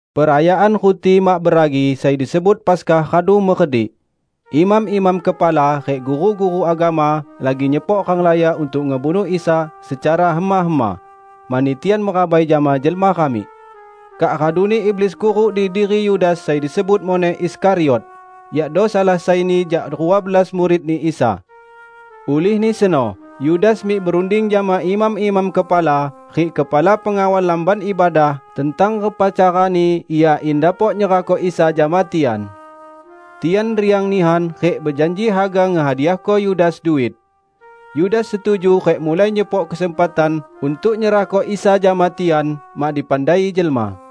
Perayaan Ruti Mak Beragi sai disebut Paskah radu meredik. Imam-imam kepala rik guru-guru agama lagi nyepok ranglaya untuk ngebunuh Isa secara hema-hema, mani tian merabai jama jelma ramik. Kak raduni iblis kuruk di diri Yudas sai disebut muneh Iskariot, yakdo salah saini jak rua belas muridni Isa. Ulihni seno Yudas mik berunding jama imam-imam kepala rik kepala pengawal Lamban Ibadah tentang repa carani ia in dapok nyerahko Isa jama tian. Tian riang nihan rik bejanji haga ngehadiahko Yudas duit. Yudas setuju rik mulai nyepok kesempatan untuk nyerahko Isa jama tian, mak dipandai jelma.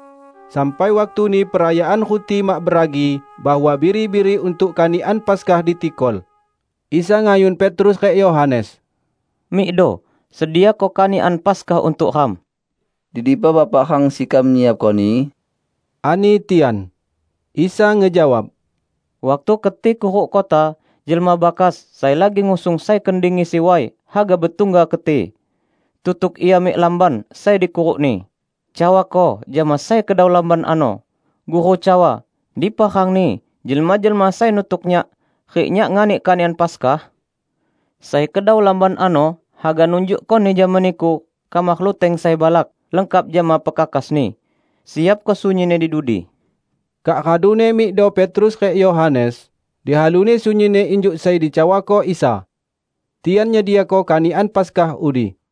Sampai waktuni Perayaan Ruti Mak Beragi bahwa biri-biri untuk kanikan Paskah ditikol. Isa ngayun Petrus rik Yohanes, "Mikdo sediako kanikan Paskah untuk ram." "Di dipa Bapak rang sekam nyiapkoni?" ani tian. Isa ngejawab, "Waktu keti kuruk kota, jelma bakas sai lagi ngusung sai kendi ngisi way haga betungga keti. Tutuk ia mik lamban sai dikurukni, cawako jama sai kedau lamban ano: Guru cawa, 'Dipa rangni jelma-jelma sai nutuk Nyak rik Nyak nganik kanikan Paskah?' Sai kedau lamban ano haga nunjukkoni jama niku kamar luteng sai balak, lengkap jama pekakasni. Siapko sunyinni di dudi." Kak raduni mikdo Petrus rik Yohanes, dihaluni sunyinni injuk sai dicawako Isa. Tian nyediako kanikan Paskah udi.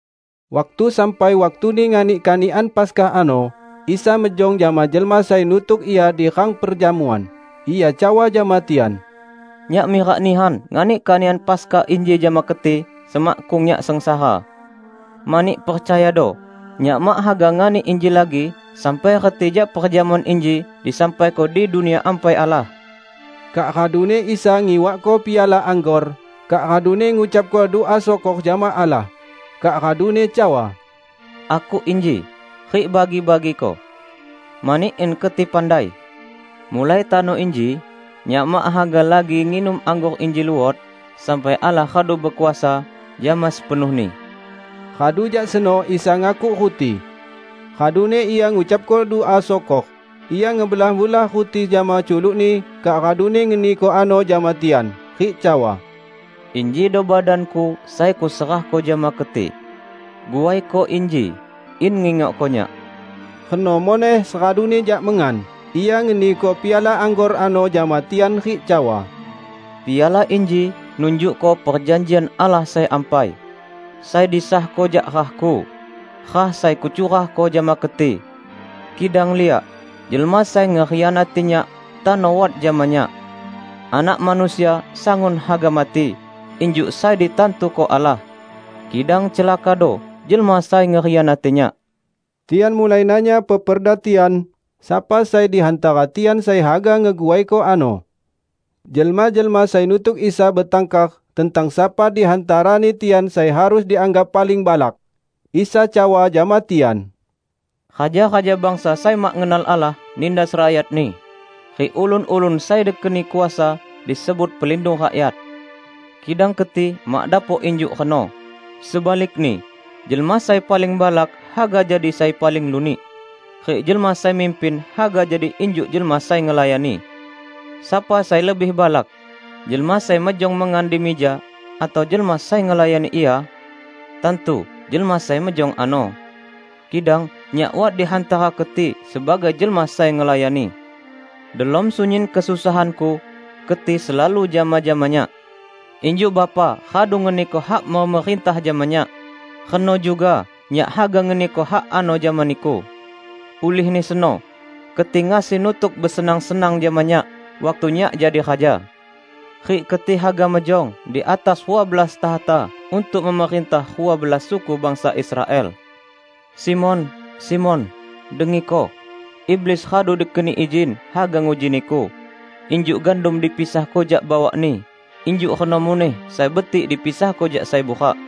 Waktu sampai waktuni nganik kanikan Paskah ano, Isa mejong jama jelma sai nutuk Ia di rang perjamuan. Ia cawa jama tian, "Nyak mirak nihan nganik kanikan Paskah inji jama keti semakkung Nyak sengsara! Mani, percayado: Nyak mak haga nganik inji lagi sampai reti jak perjamuan inji disampaiko di Dunia Ampai Allah." Kak raduni Isa ngiwakko piala anggor, kak raduni ngucapko dua syukor jama Allah, kak raduni cawa, "Akuk inji, rik bagi-bagiko; mani in keti pandai: mulai tano inji Nyak mak haga lagi nginum anggor inji luot sampai Allah radu bekuasa, jama sepenuhni." Radu jak seno Isa ngakuk ruti. Raduni Ia ngucapko dua syukor, Ia ngebelah-belah ruti jama culuk-Ni kak raduni ngeniko ano jama tian, rik cawa, "Injido badan-Ku [sai kuserahko jama keti. Guaiko inji in ngingokko Nyak." Reno muneh seraduni jak mengan, Ia ngeniko piala anggor ano jama tian rik cawa, "Piala inji nunjukko Perjanjian Allah sai ampai, sai disahko jak rah-Ku -- rah sai Kucurahko jama keti."] "Kidang liak! Jelma sai ngekhianati Nyak tano wat jama Nyak! Anak Manusia sangun haga mati injuk sai ditantuko Allah; kidang celakado jelma sai ngekhianati Nyak!" Tian mulai nanya peperda tian, sapa sai di hantara tian sai haga ngeguaiko ano. Jelma-jelma sai nutuk Isa betangkar tentang sapa di hantarani tian sai harus dianggap paling balak. Isa cawa jama tian, "Raja-raja bangsa sai mak ngenal Allah nindas rakyatni, rik ulun-ulun sai dikeni kuasa disebut 'Pelindung Rakyat'. Kidang keti mak dapok injuk reno. Sebalikni, jelma sai paling balak haga jadi sai paling lunik, rik jelma sai mimpin haga jadi injuk jelma sai ngelayani. Sapa sai lebih balak: jelma sai mejong mengan di mija, atau jelma sai ngelayani ia? Tantu jelma sai mejong ano. Kidang Nyak wat di hantara keti sebagai jelma sai ngelayani. Delom sunyin kesusahan-Ku, keti selalu jama-jama Nyak. Injuk Bapa radu ngeniko hak memerintah jama Nyak, reno juga Nyak haga ngeniko hak ano jama niku. Ulihni seno keti ngasi nutuk besenang-senang jama Nyak waktu Nyak jadi Raja. Rik keti haga mejong di atas rua belas takhta untuk memerintah rua belas suku bangsa Israel." "Simon, Simon, dengiko! iblis radu dikeni izin haga nguji niku; injuk gandum dipisahko jak bawakni injuk reno muneh sai betik dipisahko jak sai burak.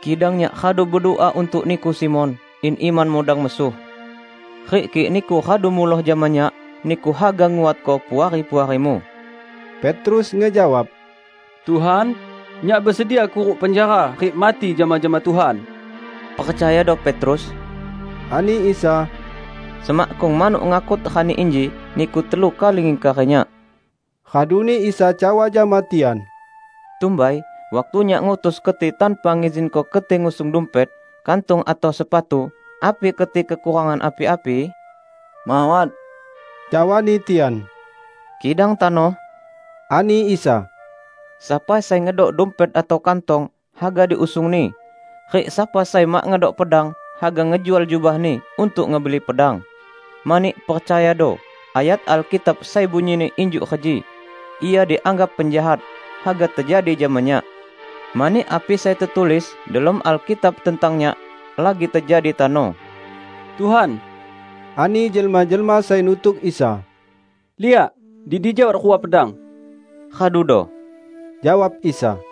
Kidang Nyak radu bedua untuk niku, Simon, in imanmu dang mesuh. Rik kik niku radu muloh jama Nyak, niku haga nguatko puari-puarimu." Petrus ngejawab, "Tuhan, nyak besedia kuruk penjara rik mati jama-jama Tuhan!" "Percayado, Petrus," ani Isa, "semakkung manuk ngakut rani inji, niku telu kali ngingkari Nyak." Raduni Isa cawa jama tian, "Tumbai waktu Nyak ngutus keti tanpa ngizinko keti ngusung dumpet, kantong atau sepatu, api keti kekurangan api-api?" "Mawat!" cawani tian. "Kidang tano," ani Isa, "sapa sai ngedok dumpet atau kantong, haga diusungni; rik sapa sai mak ngedok pedang, haga ngejual jubahni untuk ngebeli pedang. Mani, percayado, ayat Alkitab sai bunyini injuk reji, 'Ia dianggap penjahat,' haga tejadi jama Nyak. Mani api sai tetulis delom Alkitab tentang Nyak lagi tejadi tano." "Tuhan," ani jelma-jelma sai nutuk Isa, "liak, di dija wat rua pedang." "Radudo!" jawab Isa.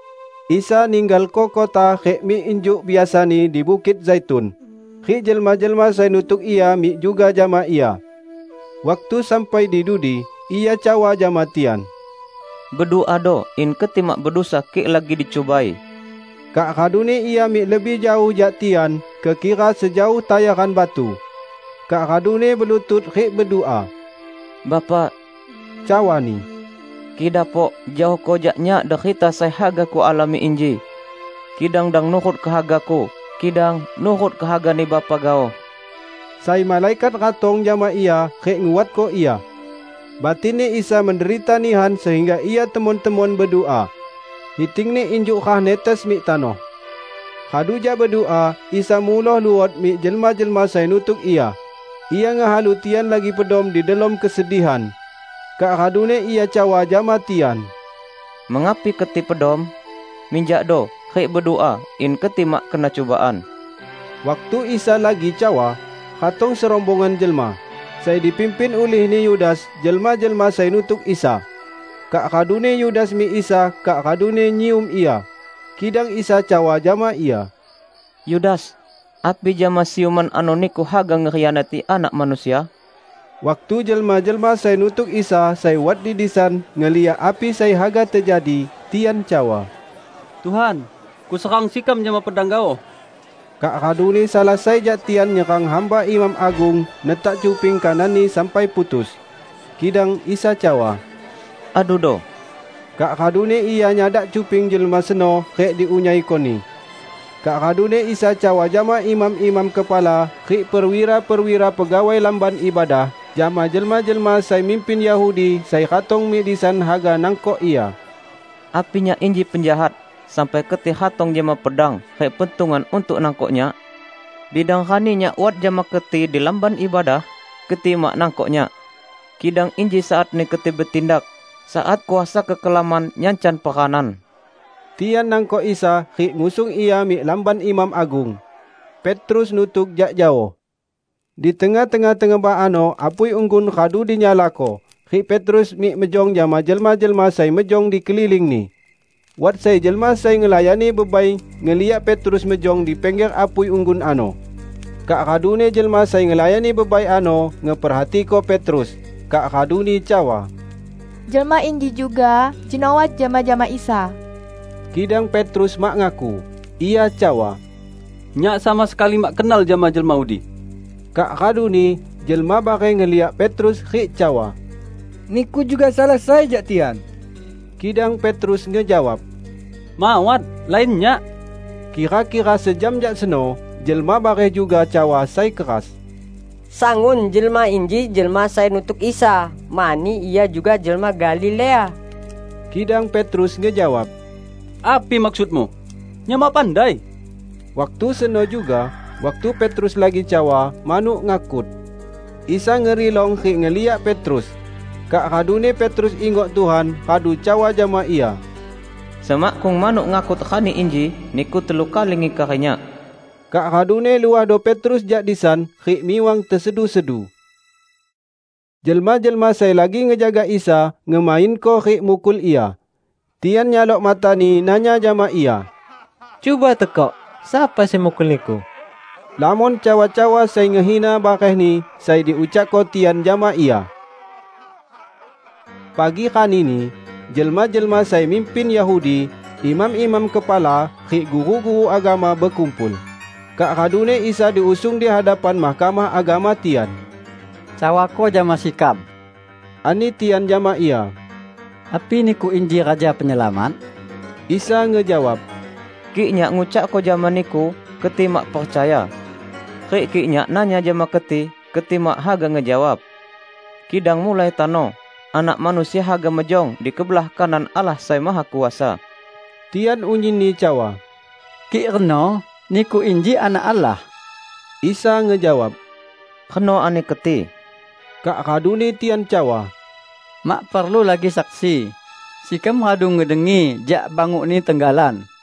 Isa ninggalko kota rik mik injuk biasani di Bukit Zaitun, rik jelma-jelma sai nutuk Ia mik juga jama Ia. Waktu sampai di dudi, Ia cawa jama tian, "Beduado in keti mak bedusa kik lagi dicubai." Kak raduni Ia mik lebih jaoh jak tian, kekira sejaoh tayaran batu, kak raduni belutut rik bedua. "Bapa," cawa-Ni, "kik dapok, jaohko jak Nyak derita sai haga Kualami inji. Kidang dang nurut kehaga-Ku, kidang nurut kehagani Bapa gaoh." [ Sai malaikat ratong jama Ia rik nguatko Ia. Batinni Isa menderita nihan sehingga Ia temon-temon bedua. Hiting-Ni injuk rah netes mik tanoh.] Radu jak bedua, Isa muloh luot mik jelma-jelma sai nutuk Ia. Ia ngehalu tian lagi pedom di delom kesedihan. Kak raduni Ia cawa jama tian, "Mengapi keti pedom? Minjakdo rik bedua in keti mak kena cubaan." Waktu Isa lagi cawa, ratong serombongan jelma. Sai dipimpin ulihni Yudas, jelma-jelma sai nutuk Isa. Kak raduni Yudas mik Isa raduni nyium Ia. Kidang Isa cawa jama Ia, "Yudas, api jama siuman ano niku haga ngekhianati Anak Manusia?" Waktu jelma-jelma sai nutuk Isa sai wat di disan ngeliak api sai haga tejadi, tian cawa, "Tuhan, sekam serang gaoh jama pedang!" Kak raduni salah sai jak tian nyerang hamba imam agung netak cuping kananni sampai putus. Kidang Isa cawa, "Adudo!" Kak raduni Ia nyadak cuping jelma seno rik diunyaiko-Ni. Kak raduni Isa cawa jama imam-imam kepala rik perwira-perwira pegawai Lamban Ibadah, jama jelma-jelma sai mimpin Yahudi sai ratong mik disan haga nangkok Ia, "Api Nyak inji penjahat sampai keti ratong jama pedang rik pentungan untuk nangkok Nyak? Bidang rani Nyak wat jama keti di Lamban Ibadah, keti mak nangkok Nyak. Kidang inji saatni keti betindak, saat kuasa kekelaman nyancan peranan." Tian nangkok Isa rik ngusung Ia mik lamban imam agung. Petrus nutuk jak jaoh. Di tengah-tengah tengebah ano apui unggun radu dinyalako rik Petrus mik mejong jama jelma-jelma sai mejong di kelilingni. Wat sai jelma sai ngelayani bebai ngeliak Petrus mejong di pingger apui unggun ano; kak raduni jelma sai ngelayani bebai ano ngeperhatiko Petrus, kak raduni cawa, "Jelma inji juga jeno wat jama-jama Isa!" Kidang Petrus mak ngaku. Ia cawa, "Nyak sama sekali mak kenal jama jelma udi!" Kak raduni, jelma bareh ngeliak Petrus rik cawa, "Niku juga salah sai jak tian!" Kidang Petrus ngejawab, "Mawat, lain nyak!" Kira-kira sejam jak seno, jelma bareh juga cawa sai keras, "Sangun jelma inji jelma sai nutuk Isa, mani ia juga jelma Galilea!" Kidang Petrus ngejawab, "Api maksudmu, nyak mak pandai!" Waktu seno juga, waktu Petrus lagi cawa, manuk ngakut. Isa ngerilong rik ngeliak Petrus. Kak raduni Petrus ingok Tuhan radu cawa jama Ia, "Semakkung manuk ngakut rani inji, niku telu kali ngingkari Nyak." Kak raduni luahdo Petrus jak disan rik miwang tesedu-sedu. Jelma-jelma sai lagi ngejaga Isa, ngemainko rik mukul Ia. Tian nyalok mata-Ni nanya jama Ia, "Cuba tekok sapa sai mukul Niku?" Lamon cawa-cawa sai ngehina barehni sai diucakko tian jama Ia. Pagi ranini, jelma-jelma sai mimpin Yahudi, imam-imam kepala, rik guru-guru agama bekumpul, kak raduni Isa diusung di hadapan Mahkamah Agama tian. "Cawako jama sekam," ani tian jama Ia, "api niku inji Raja Penyelamat?" Isa ngejawab, "Kik Nyak ngucakko jama niku, keti mak percaya. Rik kik Nyak nanya jama keti, keti mak haga ngejawab. Kidang mulai tano, Anak Manusia haga mejong di kebelah kanan Allah Sai Mahakuasa." Tian unyinni cawa, "Kik reno, Niku inji Anak Allah?" Isa ngejawab, "Reno ani keti." Kak raduni tian cawa, "Mak perlu lagi saksi! Sekam radu ngedengi jak banguk-Ni tenggalan!"